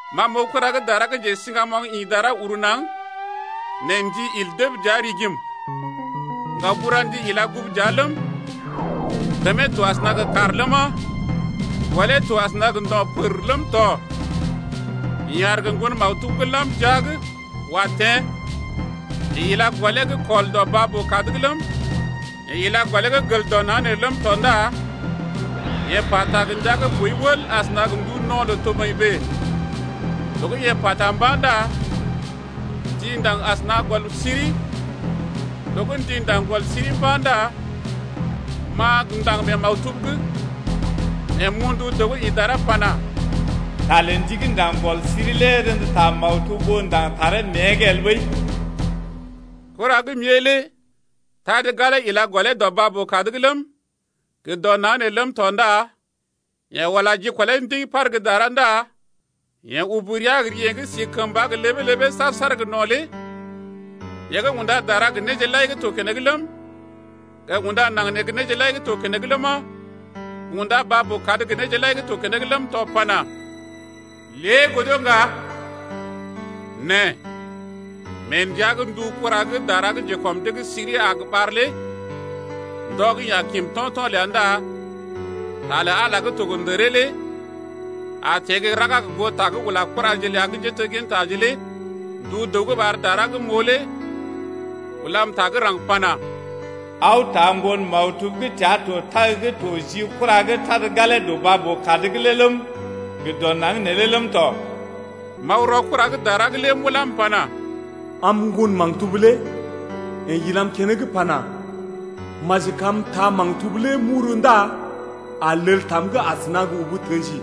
Ma m’oo kura gə́ dara gə́ njesiŋgamoŋ ḭ dara uru naŋg, nɛ ndi il dəb dəa’g rigim, ŋgaoburandi ila gugu dəa ləm, kəmee to asəna gə kàr ləma, gɔlee to asəna gə ndo̰ pər ləm tɔ. Yeḛ aar gə ŋgon maktub gə́ lam jia’g wa teḛ. Yeḛ ila gɔlee gə́ kɔl dɔ baa-boo-kad’g ləm, yeḛ ila gɔlee gə́ gel dɔ naŋg nee ləm tɔ ndá yeḛ pata gə ndia gə́ boi wəl asəna gə ndu no̰ lə toboḭ bèe. Loo gə́ yeḛ pata mba̰ ndá ndi ndaŋg asəna gə gɔl siri. Loo gə́ ndi ndaŋg gɔl siri mba̰ ndá m’a gə ndaŋg mee maktub’g, nɛ m’oo ndu dəw gə́ ḭ dara pana: Ta lə ndi gə́ ndaŋg gɔl siri lé rḛdə ta maktub ɓó ndaŋg taree mée’g el ɓəi. Kura gə́ m’ée lé tad galee ila gɔlee dɔ baa-boo-kad’g ləm, gə dɔ naŋg nee ləm tɔ ndá yeḛ ula jikɔlee ndiŋ par gə́ dara ndá yeḛ ubu rəa gə ri yeḛ gə́ si kəmba gə ləbee-ləbee saar-saar gə no̰ lé yeḛ gə́ unda dara gə néje lai gə́ to keneŋ ləm, gə unda naŋg nee gə néje lai gə́ to keneŋ ləma, gə unda baa-boo-kad gə néje lai gə́ to keneŋ ləm tɔ pana: Lée godo ŋga. Nɛ mee ndəa gə́ ndu kura gə́ dara gə́ njekɔm dee’g siri a ɓar lé ndɔ gə́ yeḛ a kim to̰to̰ ləa ndá ta lə Ala gə́ to gə ndəree lé a teḛ gə́ raga gə goo ta gə́ yeḛ ula kuraje ləa gə́ njéteggintaje lé. Ndu dəw gə́ ɓar dara gə́ m’oo lé ulam ta gə́ raŋg pana: Aw taa ŋgon maktub gə́ təa to tag gə́ to ji kura gə́ tad galee dɔ baa-boo-kad’g lé ləm, gə dɔ naŋg neelé ləm tɔ. M’aw rɔ kura gə́ dara lé m’ulá m’pana: Am ŋgon maktub lé. Yeḛ ilam keneŋ pana: Maji kam m’taa maktub lé m’uru ndá a lel tam’g asəna gə ubu tə̰ji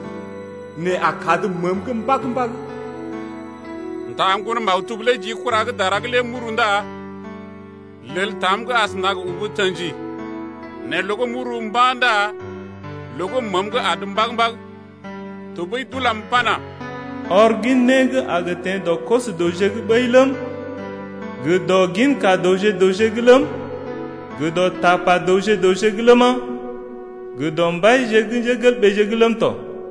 nɛ a kad məəm’g mbag-mbag. M’taa ŋgon maktub lé ji kura gə́ dara lé m’uru ndá lel tam’g asəna gə ubu tə̰ji, nɛ loo gə́ m’uru mba̰ ndá loo gə́ məəm’g adə mbag-mbag. Tɔɓəi d’ulam pana: Ɔr gin né gə́ a gə teḛ dɔ koso-dəwje’g ɓəi ləm, gə dɔ ginka dəwje’g ləm, gə dɔ tapa dəwje-dəwje’g ləma, gə dɔ mbaije’g ləm tɔ.